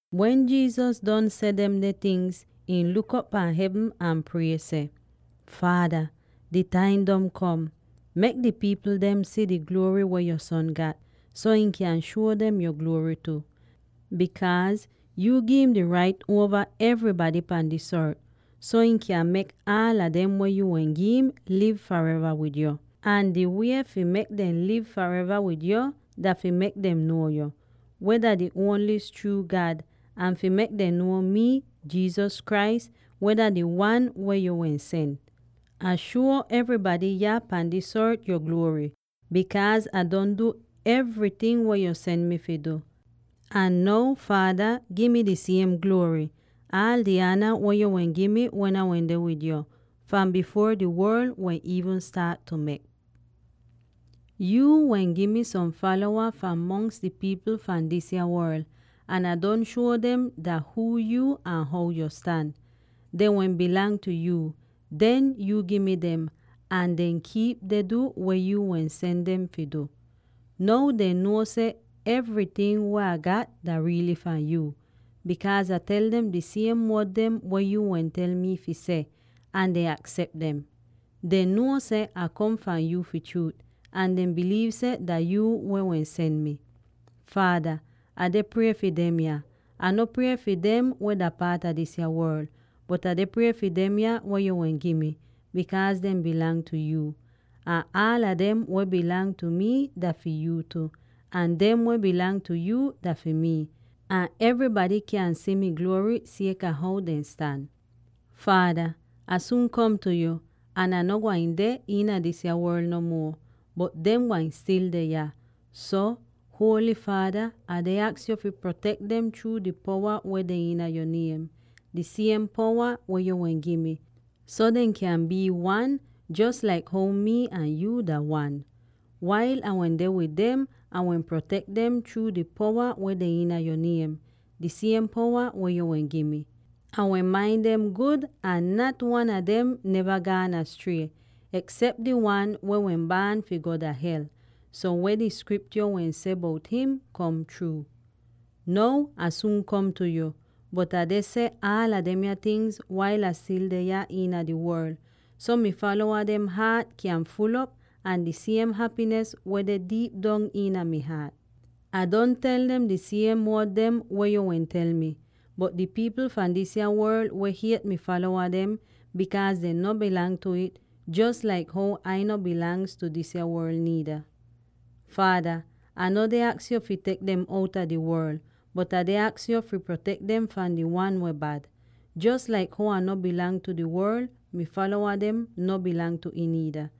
Wen Jesus don seh demde tingz, ihn luk op dah hevn ahn prie seh, “Faada, di taim don kom. Mek di pipl dem si di gluory weh yo Son gat, so ihn kyan shuo dem yo gluory tu; bikaaz yu gi'im di rait uova evrybady pahn dis ort, so ihn kyan mek aala dem weh yu wehn gi'im liv fareva wid yo. Ahn di wie fi mek dem liv fareva wid yo dah fi mek dem nuo yu, weh dah di ongli'is chruu God, ahn fi mek dem nuo mii, Jesus Christ, weh dah di Wan weh yu wehn sen. Ah shuo evrybady yah pahn dis ort yo gluory, bikaaz Ah don du evryting weh yu sen mi fi du. Ahn now, Faada, gi mi di siem gluory —aal di ana weh yo wehn gi mi wen Ah wende wid yo— fahn bifuor di worl wehn iivn staat mek. “Yuu wehn gi mi som falowa fahn mongs di pipl fahn disa worl ahn Ah don shuo dem dah huu yu ahn how yo stan. Dehn wehn dah fi yu; den yuu gi mi dem, ahn dehn kiip deh du weh yu wehn seh dehn fi du. Now dehn nuo seh evryting weh Ah gat dah riily fahn yu; bikaaz Ah tel dem di siem wod dem weh yu wehn tel mi fi seh, ahn dehn aksep dem. Dehn nuo seh Ah kom fahn yu fi chruut, ahn dehn biliiv seh dah yuu wehn sen mii. Faada, Ah deh prie fi demya; Ah no prie fi dem weh dah paat a disa worl, bot Ah deh prie fi demya weh yu wehn gi mi, bikaaz dehn dah fi yu tu. Ahn aala dem weh dah fi mi, dah fi yu tu; ahn dem weh dah fi yu, dah fi mi. Ahn evrybady kyan si mi gluory sieka how dehn stan. “Faada, Ah suun kom tu yu, ahn Ah no gwain deh iina disa worl no muo, bot dem gwain stil deh yah. So, Holy Faada, Ah deh aks yo fi protek dem chruu di powa weh deh iina yo niem, di siem powa weh yo wehn gi mi, so dem kyan bii wan, jos laik how mii ahn yu dah wan. Wail Ah wende wid dem, Ah wehn protek dem chruu di powa weh deh iina yo niem, di siem powa weh yu wehn gi mi. Ah wehn main dem gud ahn nat wan a dem neva gaan astrie, eksep di wan weh wehn baan fi go dah Hel, so weh di Skriptyo wehn seh bout him kom chruu. “Now Ah suun kom tu yu, bot Ah deh seh aala demya tingz wail Ah stil deh yah iina di worl, so mi falowa dehn haat kyan ful'op a di siem hapinis weh deh diip dong iina mi haat. Ah don tel dem di siem wod dem weh yu wehn tel mii, bot di pipl fahn disa worl wehn hiet mi falowa dem, bikaaz dehn no dah fi ih, jos laik how Ah no dah fahn disa worl niida. “Faada, Ah no deh aks yo fi tek dem outa di worl, bot Ah deh aks yo fi protek dem fahn di Wan weh Bad. Jos laik how Ah dah no fi di worl, mi falowa dem no bilang tu ih niida.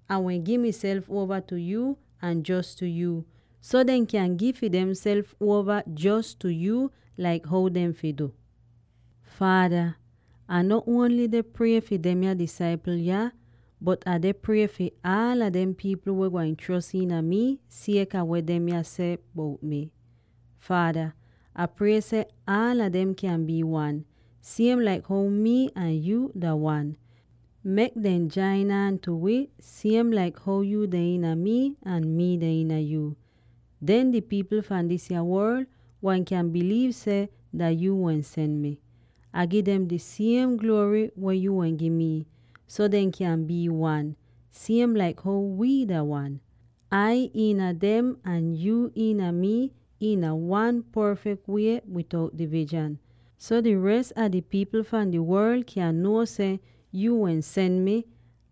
Ah wehn gi miself uova tu yu, ahn jos tu yu, so dehn kyan gi fi demself uova jos tu yu tu, laik how dehn fi du. “Faada, Ah no ongl deh prie fi demya disaipl yah, bot Ah deh prie fi aala dem pipl weh gwain chros iina mii sieka weh demya seh bout mii. Faada, Ah prie seh aala dem kyan bii wan, siem laik how mii ahn yu dah wan. Mek dem jain aan tu wi siem laik how yu deh iina mii ahn mii deh iina yu. Den di pipl fahn disa worl gwain kyan biliiv seh dah yuu wehn sen mi. Ah gi dem di siem gluory weh yu wehn gi mi, so dehn kyan bii wan, siem laik how wii dah wan. Ai iina dem ahn yuu iina mii iina wan porfek wie bitout divizhan, so di res a di pipl fahn di worl kyan nuo seh yu wehn sen mi,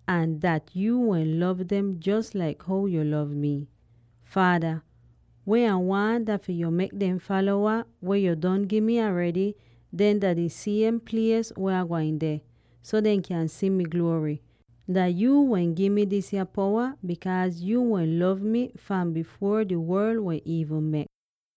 ahn seh yu wehn lov dem jos laik how yu lov mii. “Faada, weh Ah waahn dah fi yo mek dem falowa, weh yu don gi mi aredy, deh dah di siem plies weh Ah gwain deh, so dehn kyan si mi gluory. Dah yuu wehn gi mi disa powa, bikaaz yuu wehn lov mi fahn bifuor di worl wehn iivn mek.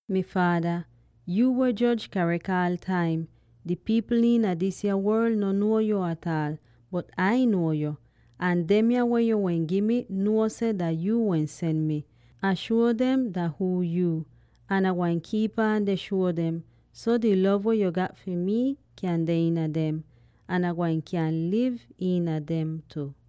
“Mi Faada, yu weh joj rait aal di taim, di pipl iina disa worl no nuo yu ataal, bot Ai nuo yu, ahn dem weh yo wehn gi mi nuo seh dah yu wehn sen mii. Ah shuo dem dah huu yu, ahn Ah gwain kiip aan deh shuo dem, so di lov weh yu gat fi mi kyan deh iina dem, ahn Ah gwain kyan liv iina dem tu.”